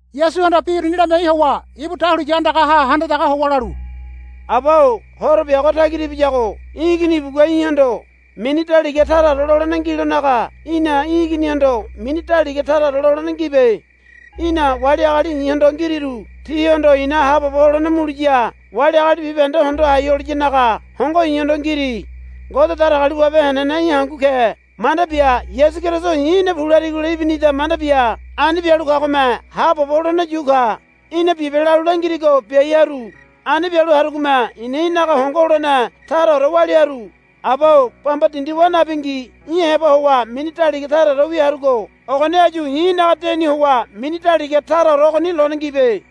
Yasuhanda bi uruni lamiai howa ibu dahuliya andagaha handa daga howa lalu, Aba-o horo biago tagira ibiyago í̠ igini ibugua í̠hondo mini daliga taraore lolene ngilonaga í̠na í̠ iginihondo mini daliga taraore lolene ngibe. Í̠na wali agali i̱hondo ngiriru tihondo i̱na haabobo holene muliya wali agali bibahende hondo hai holiyanaga hongo i̱hondo ngiri. Ngode Datagaliwabe henene í̠ hangu ke manda bia Yasu Keriso i̱ í̠na pu larigola ibinida manda bia ani bialu kagome haabobo holene yu ka. Í̠na bibe lalu langirigo biai haru. Ani bialu harugome i̱na í̠naga hongo holene taraore walia haru. Aba-o bamba dindi wa nabingi í̠ heba howa mini daliga taraorewi harugo ogoni áyu i̱ í̠naga deni howa mini daliga taraore ogoni lone ngibe.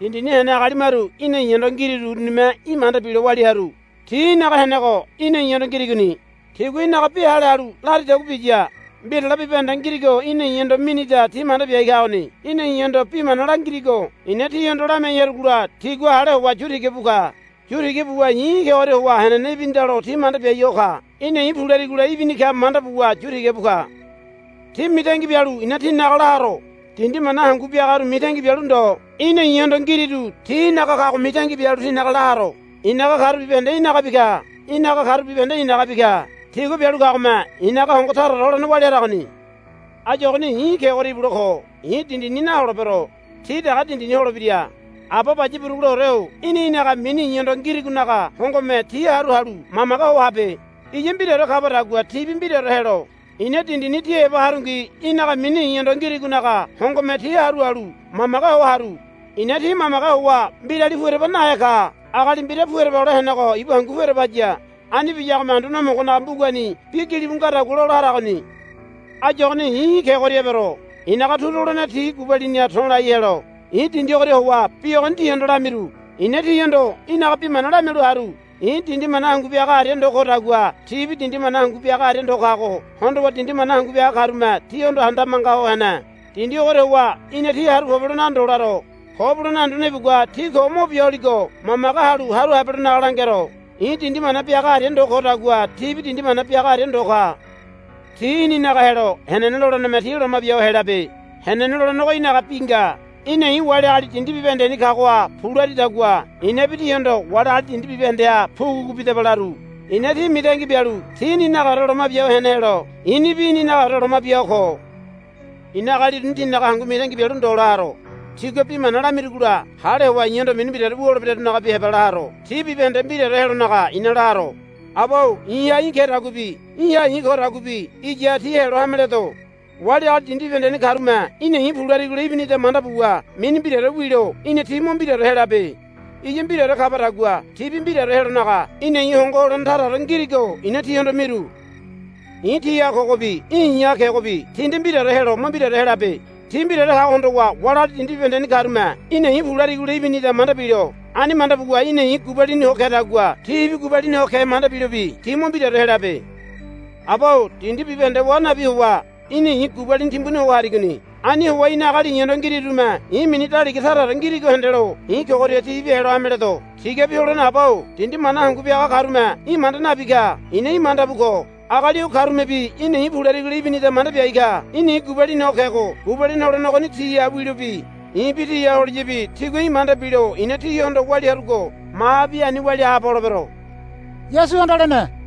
Dindini hene agali maru í̠na i̱hondo ngiriru urunime í̠ manda bilo walia halu haru. Ti í̠naga henego í̠na i̱hondo ngirigoni. Tigua í̠naga bi hale halu laridagua biya. Mbirale bibahende ngirigo í̠na i̱hondo minida ti manda biai kagoni. Í̠na i̱hondo bi mana langirigo i̱na tihondo lamiai harugola tigua hale howa yu tiga bu ka. Yu tiga buwa i̱ í̠ kegoria howa henene ibinidalo ti manda biai ho ka. Í̠na i̱ pu larigola ibini ka manda buwa yu tiga bu ka. Ti mitangi bialu i̱na tinaga la haro. Dindi mana hangu biagaru mitangi bialu ndo í̠na i̱hondo ngiriru ti í̠naga kago mitangi bialu tinaga la haro. I̱naga karu bibahende í̠nagabi ka. Í̠naga karu bibahende i̱nagabi ka. Tigua bialu kagome i̱naga hongo taraore holene walia haragoni. Áyu ogoni i̱ í̠ kegoria ibule ko. I̱ dindini naholebero. Ti dege dindini holebira. Aba Baya Buruguleore-o í̠na í̠naga mini i̱hondo ngirigonaga hongome ti haru halu mamage ho habe. Iya mbiraore kabadagua tibi mbiraore helo. I̱na dindini ti heba harungi í̠naga mini i̱hondo ngirigonaga hongome ti haru halu mamage ho haru. I̱na ti mamage howa mbirali pu ereba nahe ka. Agali mbira pu ereba hole henego ibu hangu pu ereba haya. Ani biyagome Anduane Homogonaga mbugani bi gilibu ngadagua lola haragoni. Áyu ogoni i̱ í̠ kegoria ebero. I̱naga turu holene ti gubaliniha to̱lai helo i̱ dindi ogoria howa bi ogoni tihondo lamiru. I̱na tihondo í̠naga bi mana lamialu haru. I̱ dindi mana hangu biaga aria ndo kodagua tibi dindi mana hangu biaga aria ndo kago hondowa dindi mana hangu biagarume tihondo handabe manga ho hene. Dindi ogoria howa í̠na ti haru pobelonaga ndo laro. Ko Bulene Anduane ibugua ti ko mo bia holigo mamage halu haru habelonaga langero. I̱ dindi mana biaga aria ndo kodagua tibi dindi mana biaga aria ndo ka. Ti í̠ninaga helo henene loleneme ti loma bia ho helabe. Henene lolenego í̠naga bi nga. Í̠na i̱ wali agali dindi bibahendeni kagoha pu laridagua i̱nabi tihondo wali agali dindi bibahendeha pugupugu bidaba laru. I̱na ti mitangi bialu ti í̠ninagaore loma bia hene helo i̱nibi í̠ninagaore loma bia ho ko. I̱na agali uruni tinaga hangu mitangi bialu ndo la haro. Tigua bi mana lamiragola hale howa i̱hondo mini mbiraore wu holebirarunagabi heba la haro. Ti bibahende mbiraore helonaga i̱na la haro. Aba-o i̱ha í̠ kedaguabi í̠ha i̱ kodaguabi iyaha ti helo hameledo. Wali agali dindi bibahendeni karume í̠na i̱ pu larigola ibinida manda buwa mini mbiraore wilo í̠na ti mo mbiraore helabe. Iya mbiraore kabadagua tibi mbiraore helonaga í̠na i̱ hongo holene taraore ngirigo i̱na tihondo miru. I̱ tiha kogobi í̠ i̱ha kegobi ti nde mbiraore helo mo mbiraore helabe. Ti mbiraore kago hondowa wali agali dindi bibahendeni karume í̠na i̱ pu larigola ibinida manda bilo. Ani manda buwa í̠na i̱ gubalini ho kedagua tibi gubalini ho ke manda bilobi ti mo mbiraore helabe. Aba-o dindi bibahende wa nabi howa í̠na i̱ gubalini timbuni ho harigoni. Ani howa í̠na agali i̱hondo ngirirume i̱ mini daliga taraore ngirigo hendelo i̱ kogoria tibi helo hameledo. Tigabi Holene Aba-o dindi mana hangu biaga karume í̠ manda nabi ka. I̱na í̠ manda bu ko. Agali o karumebi í̠na i̱ pu larigola ibinida manda biai ka. Í̠na i̱ gubalini ho kego gubalini holene ogoni tiha wilobi i̱bi tiha holiyabi tigua í̠ manda bilo i̱na tihondo walia harugo mahabi ani walia haabo holebero, Yasuhanda lene.